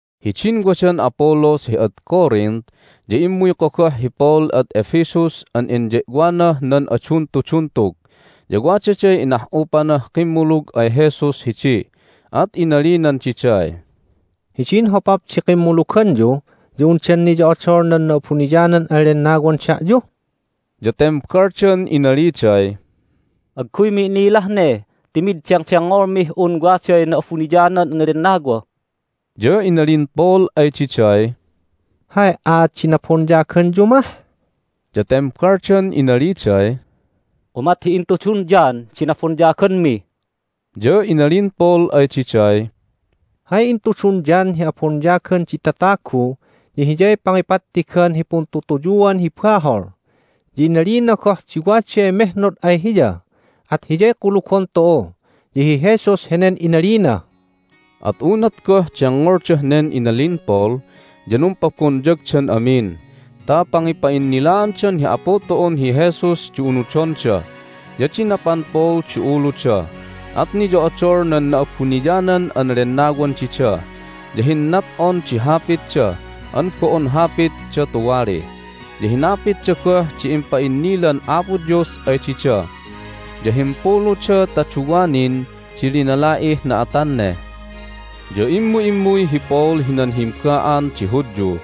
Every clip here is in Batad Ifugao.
Hidin wadan Apollos hi ad Corinth ya immuy kogoh hi Paul ad Ephesus an inye'wanah nan aduntuduntug. Ya wadaday inah'upanah kimmulug ay Jesus hidi, at inalinan diday, "Hidin hopap di kimmuluganyu ya undan niyo'odol nan Na'abuniyanan an Lennawan da'yu?" Ya tembaldan inaliday, "Agguymi inilah ne ti mid dengdengngolmih un waday Na'abuniyanan an Lennawa." Ya inalin Paul ay diday, "Hay aat di nabonyaganyu mah?" Ya tembaldan inaliday, "Umat hi intudun John di nabonyaganmi." Ya inalin Paul ay diday, "Hay intudun John hi abonyagan di tatagu ya hiyay pangipattigan hi puntutuyuan hi bahol. Ya inalina goh di waday mehnod ay hiya, at Hiyay kulugon tu'u, ya hi Jesus henen inalina." At unat goh dengngoldah nen inalin Paul ya numpabonyagdan amin ta pangipa'innilaandan hi Apu tu'un hi Jesus di unudonda. Ya dinapan Paul di uluda, at niyo'odol nan Na'abuniyanan an Lennawan dida, ya hinnat'on di hapitda an bo'on hapitda tuwali, ya hinapitda goh di impa'innilan Apo Dios ay dida. Ya himpuluda ta duwa nin di linala'ih na'atan ne. Ya immu'immuy hi Paul hinan himba'an di Hudyu,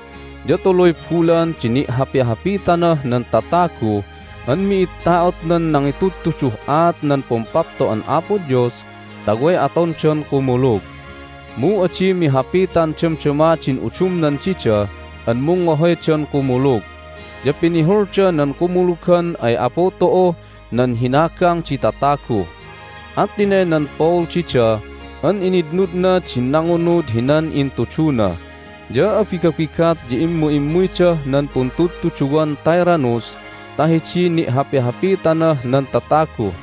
ya tuluy bulan di ni'hapihapitanah nan tatagu an mi'id ta'otnan nangitudtudun aat nan Pumpapto'an Apo Dios ta way atondan kumulug. Mu adi mihapitan damdama din udumnan dida an mungngohoydan kumulug, ya pinihulda nan kumulugan ay Apu tu'uh nan hinagang di tatagu. At tinaynan Paul dida an initnudna din nangunud hinan intuduna. Ya abigabigat ya immu'immuydah nan puntudtuduwan Tyrannus ta hidiy ni'hapihapitanah nan tatagu.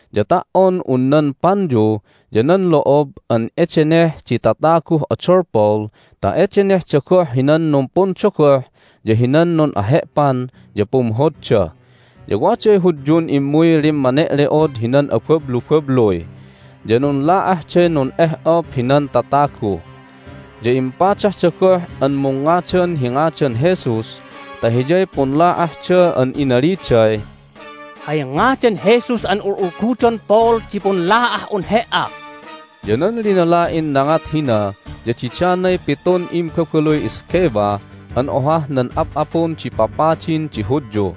ya ta"on un nan panyu ya nan lo'ob an edeneh di tataguh odol Paul ta edenehda goh hinan numpundogoh ya hinan nun'ahe'pan, ya pumhodda. Ya waday Hudyun immuy lemme'ole'od hinan abablubabluy, ya nunla'ahday nun'eh'op hinan tatagu. Ya impadahda goh an mungngadan hi ngadan Jesus ta Hiyay punla'ahda an inaliday, "Hay ngadan Jesus an ul'ulgudon Paul di punla'ah'un he"a!" Ya nan linala'in nangat hina ya didanay pitun imbabaluy Sceva an ohah nan ap'apun di papadin di Hudyu.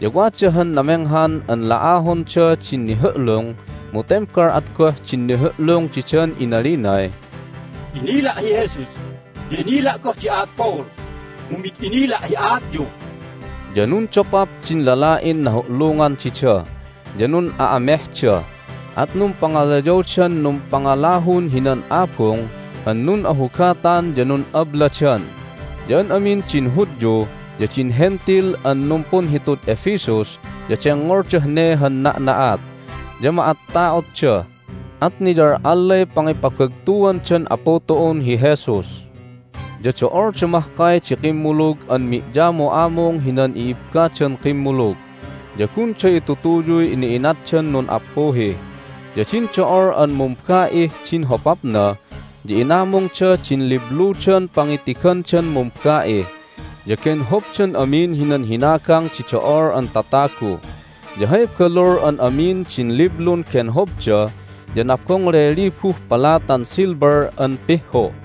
Ya wada han namenghan an la'ahonda din nihu'lung, mu tembal at goh din nihu'lung didan inalinay, "Inila' hi Jesus, ya inila' goh di aat Paul, mu mid inila' hi aatyu!" Ya nundopap din lala'in nahu'lungan dida, ya nun'a'amehda. At numpangalayawdan numpangalahun hinan abung an nun'ahugatan ya nun'abladan. Ya an amin din Hudyu ya din Hentil an numpunhitud Ephesus ya dengngoldah ne han na'na'at, ya ma'atta'otda, at niyal'allay pangipabagtuandan Apu tu'un hi Jesus! Ya do'olda mahkay di kimmulug an mi'yamu'amung hinan i'ibbadan kimmulug, ya gunda itutuyuy ina'inatdan nun'appuhi. Ya din do'ol an mumba'ih din hopapna ya inamungda din libludan pangitigandan mumba'i, ya genhobdan amin hinan hinagang di do'ol an tatagu. Ya hay balul an amin din liblun genhobda ya nabongley libuh palatan silver an pihhu.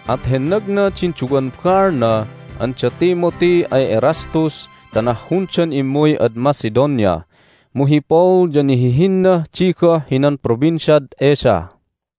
At hennagna din duwan baalna an da Timothy ay Erastus ta nahhundan immuy ad Macedonia, mu hi Paul ya nihihinnah di goh hinan Provinciad Asia.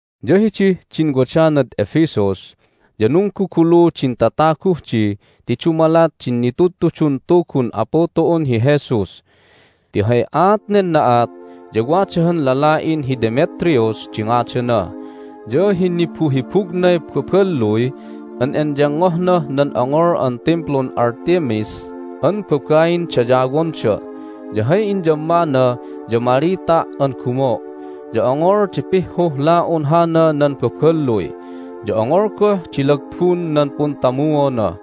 Ya hidih din wadanad Ephesus ya nunggugulu din tataguh di ti dumalat din nitudtudun Tugun Apu tu'un hi Jesus. Ti hay aat nen na'at ya wada han lala'in hi Demetrius di ngadana, ya hinibuhibugnay baballuy an enyengngohnah nan ongol an Timplun Artemis an babain dayawonda. Ya hay inyammana ya malita' an gumo'. Ya ongol di pihhuh la'un hana nan baballuy, ya ongol goh di lagbun nan puntamuona.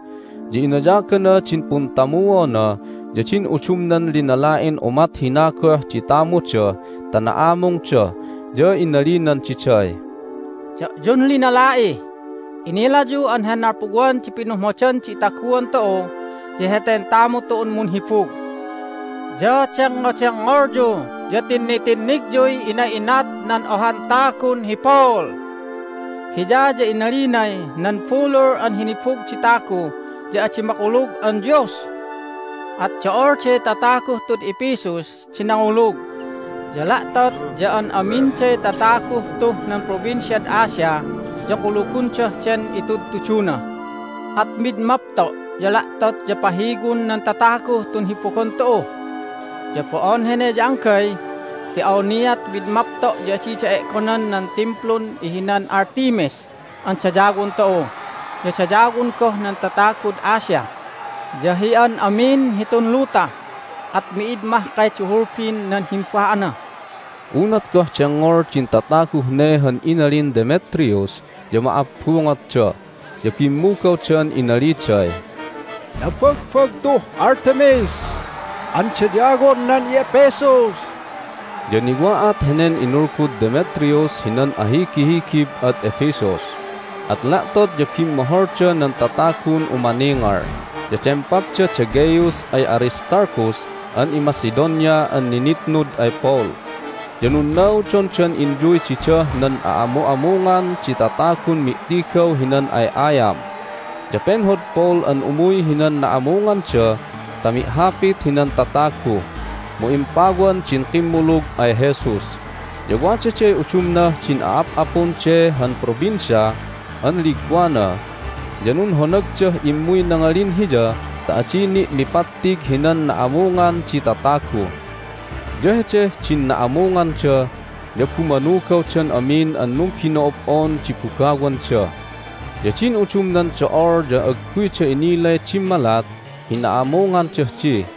Ya inayagana din puntamuona ya din udumnan linala'in umat hina goh di tamuda ta na'amungda, ya inalinan diday, "Da'yun linala'i, inilayu an hay nalpuwan di pinumhodan di itaguan tu'u ya heten tamu tu'un munhibug. Ya dengngodengngolyu ya tinnitinnigyuy ina'inat nan ohan tagun hi Paul. Hiya ya inalinay nan bulul an hinibug di tagu ya adi makulug an dios! At do'olday tataguh tud Ephesus di nangulug, ya la'tot ya an aminday tataguh tuh nan Provinciad Asia ya kulugondah den itudtuduna. At mid mapto' ya la'tot ya pahiwon nan tatagu tun hibugon tu'u! Ya bo'on hene ya anggay, ti awniat mid mapto' ya adida e'gonan nan Timplun ihinan Artemis an dayawon tu'u, ya dayawon goh nan tatagud Asia, ya hi an amin hitun luta, at mi'id mahkay di hulbin nan himba'ana!" Unat goh dengngol din tataguh ne han inalin Demetrius ya ma'abbungotda, ya bimmugawdan inaliday, "Nabagbagtuh Artemis an dayawon nan i'Ephesus!" Ya niwa'at henen inulgud Demetrius hinan ahigihigib ad Ephesus, at la'tot ya bimmoholda nan tatagun umaningal. Ya dempapda da Gaius ay Aristarchus an iMacedonia an ninitnud ay Paul, ya nunnaudondan inyuy didah nan a'amu'amungan di tatagun mi'tigaw hinan ay'ayam. Ya penhod Paul an umuy hinan na'amunganda ta mi'hapit hinan tatagu, mu impawan din kimmulug ay Jesus. Ya wadaday udumnah din a'ap'apun de han provincia an ligwana, ya nunhonagdah immuy nangalin hiya ta adi ni' mipattig hinan na'amungan di tatagu. Ya hedeh din na'amunganda ya bumanugawdan amin an numbino'ob'on di bugawanda. Ya din udumnan do'ol ya agguyda inilay dimmalat hi na'amungandah di.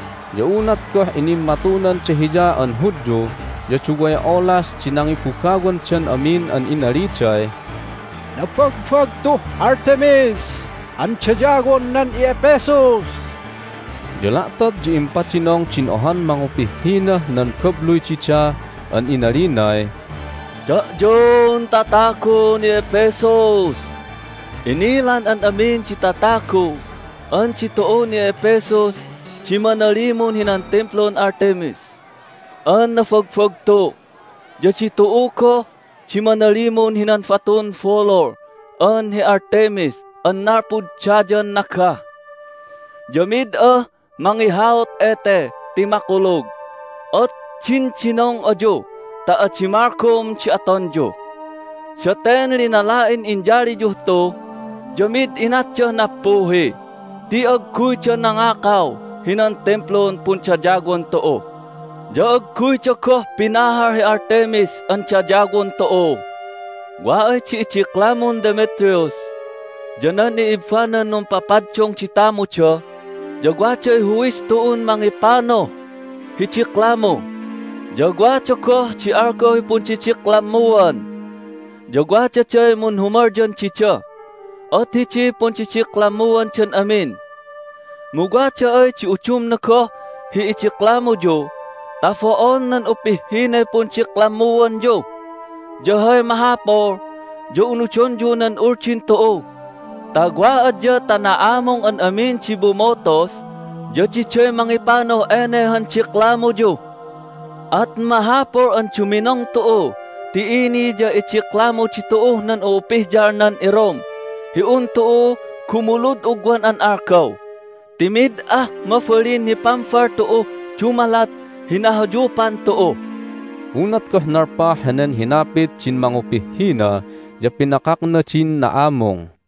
Ya unat goh inimmatunanda hiya an Hudyu ya duway olas di nangibugawandan amin an inaliday, "Nabagbagtuh Artemis an dayawon nan i'Ephesus!" Ya la'tot ya impadinong din ohan mangupihhinah nan babluy dida an inalinay, "Da'yun tatagun i'Ephesus, inilan an amin di tatagu an ditu'un i'Ephesus di manalimun hinan Timplun Artemis an nabagbagtu, ya ditu'u goh di manalimun hinan batun bulul an hi Artemis an nalpud dayan nagah. Ya mid ah mangihaut ete ti makulug, at dindinong ayu ta adi malgom di atonyu! Daten linala'in inyaliyuh tu ya mid inatdah nappuhi ti agguyda nangakaw hinan Timplun pundayawan tu'u, ya agguyda goh pinahal hi Artemis an dayawon tu'u. Wa ay di idiklamun Demetrius ya nan i'ibbanan numpapaddung di tamuda ya waday huwis tu'un mangipanuh hi diklamu, ya wada goh di algaw hi pundidiklammuan, ya wadaday munhumalyan dida, at hidiy pundidiklammuandan amin. Mu wada ay di udumna goh hi idiklamuyu ta bo'on nan upihhinay pundiklammuanyu ya hay mahapul ya unudonyu nan uldin tu'u ta wa adya ta na'amung an amin di bumutus ya diday mangipanuh ene han diklamuyu. At mahapul an duminong tu'u ti ini ya idiklamu ditu'uh nan u'upihyal nan iRome hi un tu'u gumulud ugwan an algaw, ti mid ah mabalin hi pambal tu'uh dumalat hi nahayupan tu'u!" Unat goh nalpah henen hinapit din mangupihhina ya pinakakna din na'amung.